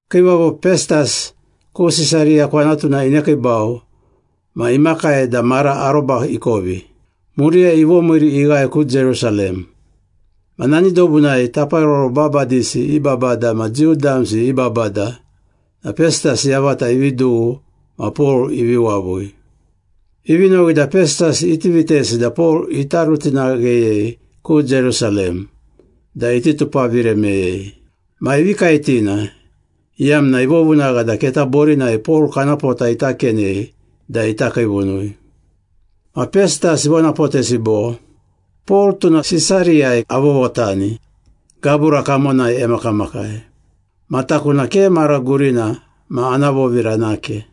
Kiivavo Pestas ku Sisariya kwanatuna inekiibau ma imakai da mara aroba ikovi. Muriyai ivomiiri ighae ku Jerusalem. Ma nani dobunai taparoro babadisi i babada ma Jiu damsi i babada na Pestas yavata ivi dughu ma Pol ivi wavui. Ivi nowi da Pestas iti vitesi da Pol ita rutinagheyei ku Jerusalem da iti tupavire meyei. Ma ivi kaetina, iyamna ivovunagha da keta borinai Pol kana pota ita kenei da ita kiivunui. Ma Pestas ivonapotesi bo, “Pol tuna Sisariyai avovotani gabura kamonai emakamakai. Ma taku na ke mara gurina ma ana vovira nake.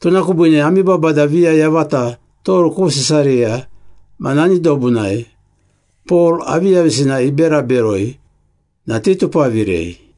Tuna kubiine ami babada viya yavata toru ku Sisariya ma nani dobunai, Pol aviyavisina ibera beroi, na titupavirei.”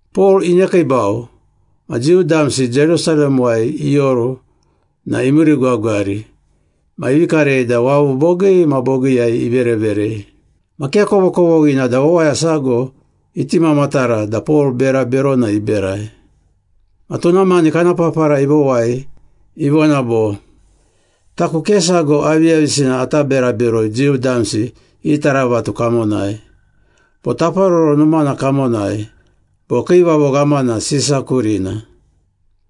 Pol inekiibau ma Jiu damsi Jerusalemuwai ioru na imiirigwagwari ma ivi karei da wavu bogii ma bogiiyai ivereverei. Ma ke kovokovoghina da wawaya sago iti mamatara da Pol bera berona iberai. Ma tuna mani kana papara ivowai, ivona bo, “Taku ke sago aviyavisina ata bera beroi Jiu damsi i taravatu kamonai, bo Taparoro Numana kamonai, bo Kiivavo Ghamana Sisa kurina.”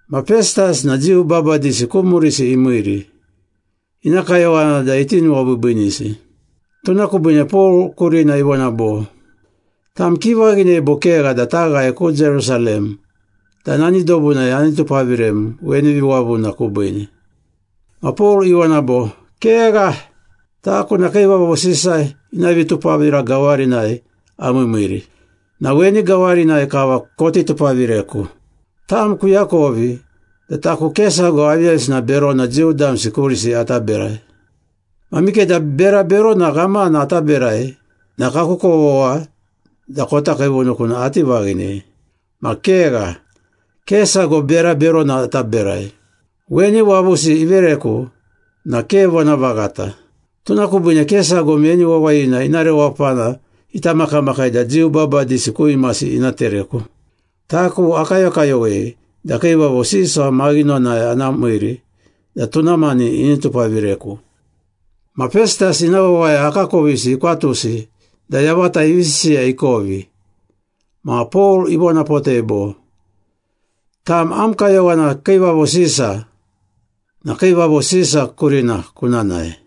Ma Pestas na Jiu babadisi ku murisi imiiri, ina kayowana da iti nuwabiibiinisi. Tuna kubiine Pol kurina ivona bo, “Tam kivaghinei bo kegha da taghae ku Jerusalem da nani dobunai ani tupavirem weni viwavuna kubiine?” Ma Pol ivona bo, “Kegha! Taku na Kiivavo Sisa ina vitupavira gawarinai amiimiiri, na weni gawarinai kava koti tupavireku. Tam kuakovi da taku ke sago aviyavisina berona Jiu damsi kurisi ata berai. Ma mikeda bera berona ghamana ata berai na kaku kovogha da kota kiivunuku na ati vaghinei. Ma kegha, ke sago bera berona ata berai. Weni wavusi ivereku na ke vonavaghata. Tuna kubiine ke sago meni wawayina ina rewapana ita makamakai da Jiu babadisi ku imasi ina tereku. Taku akayokayowei da Kiivavo Sisa maghinonai ana miiri da tuna mani ini tupavireku.” Ma Pestas ina wawaya akakovisi ikwatusi da yavata ivi sisiya ikovi, ma Pol ivonapotei bo, “Tam am kayowana Kiivavo Sisa, na Kiivavo Sisa kurina kuna nae.”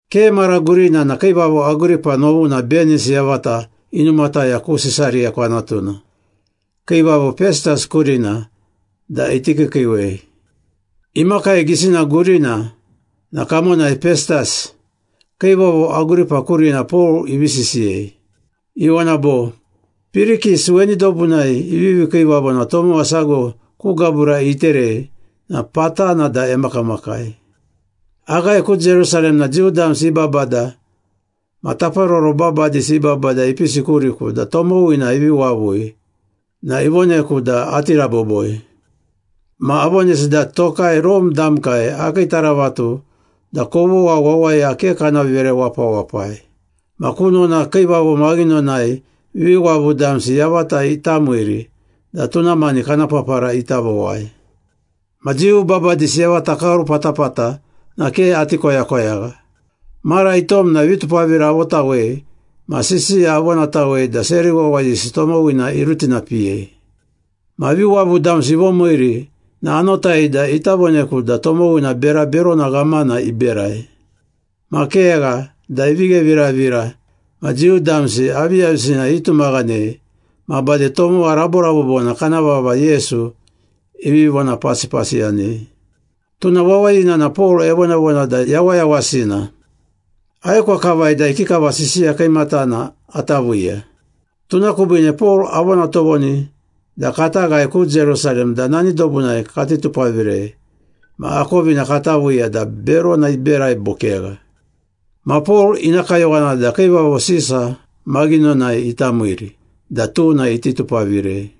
Ke mara gurina na kiivavo Agripa novuna Benis yavata inumataya ku Sisariya kwanatuna, kiivavo Pestas kurina da iti kiikiiwei. Imakai gisina gurina na kamonai Pestas, kiivavo Agripa kurina Pol ivi sisiyei. Ivona bo, “Pirikis weni dobunai ivivi kiivavo na tomowa sago ku gabura iterei na patana da emakamakai. Aghae ku Jerusalem na Jiu damsi i babada ma taparoro babadisi i babada ipisi kuriku da tomowina ivi wavui na ivoneku da ati raboboi. Ma avonesi da tokai Rome damkai akii taravatu da kovogha wawaya ke kana vere wapawapai. Ma kunona kiivavo maghinonai viwavu damsi yavata ita miiri da tuna mani kana papara ita vowai. Ma Jiu babadisi yavata kaoru patapata na ke ati koyakoyagha. Mara itom na vitupavira avotawei ma sisiya avonatawei da seri wawayisi tomowina irutinapiyei. Ma viwavu damsi ivomiiri na anotai da ita voneku da tomowina bera berona ghamana iberai. Ma kegha da ivi gheviravira ma Jiu damsi aviyavisina itumaghanei ma bade tomowa raborabobona kana vava Yesu ivi vonapasipasiyanei. Tuna wawayina na Pol evonavona da yawayawasina. Aekwa kavai da ikikava sisiya kiimatana ata viiya. Tuna kubiine Pol avona tovoni da kata ghae ku Jerusalem da nani dobunai kati tupavirei ma akovina kata viiya da berona iberai bo kegha. Ma Pol ina kayowana da Kiivavo Sisa maghinonai ita miiri da tuna iti tupavirei.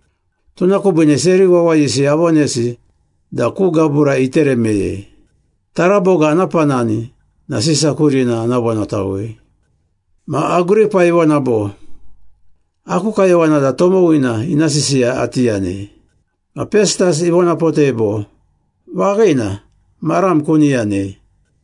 Tuna kubiine seri wawayisi avonesi da ku gabura itere meyei. Taraboga ana panani na Sisa kurina ana vonatawei.” Ma Agripa ivona bo, “Aku kayowana da tomowina ina sisiya ati yanei.” Ma Pestas ivonapotei bo, “Vaghina, maram kuni yanei.”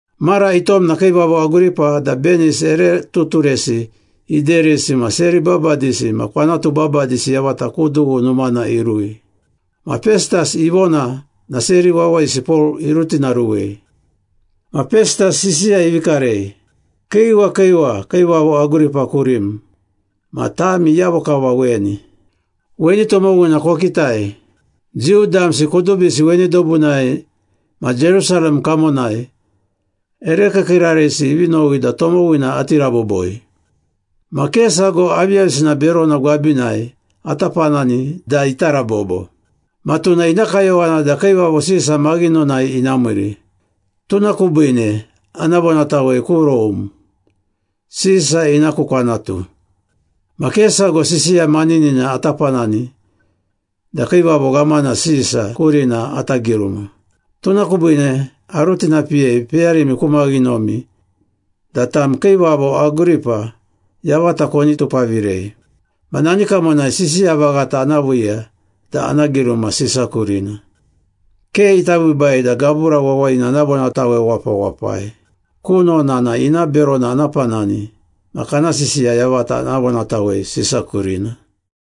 Mara itom na kiivavo Agripa da Benis ere tuturesi iderisi ma seri babadisi ma kwanatu babadisi yavata ku dughu numana irui. Ma Pestas ivona na seri wawayisi Pol irutinaruwei. Ma Pestas sisiya ivi karei. “Kiiwa kiiwa, kiivavo Agripa kurim ma tami iyavo kava weni. Weni tomowina kokitai. Jiu damsi kudubisi weni dobunai ma Jerusalem kamonai ere kiikiirarisi ivi nowi da tomowina ati raboboi. Ma ke sago aviyavisina berona gwabinai ata panani da ita rabobo. Ma tuna ina kayowana da Kiivavo Sisa maghinonai ina miiri, tuna kubiine ana vonatawei ku Rome, Sisa ina ku kwanatu. Ma ke sago sisiya maninina ata panani da Kiivavo Ghamana Sisa kurina ata giruma. Tuna kubiine arutinapiyei peyarimi ku maghinomi da tam kiivavo Agripa yavata koni tupavirei. Ma nani kamonai sisiya vaghata ana viiya da ana giruma Sisa kurina. Ke ita biibai da gabura wawayina ana vonatawe wapawapai. Kunona na ina berona ana panani ma kana sisiya yavata ana vonatawei Sisa kurina.”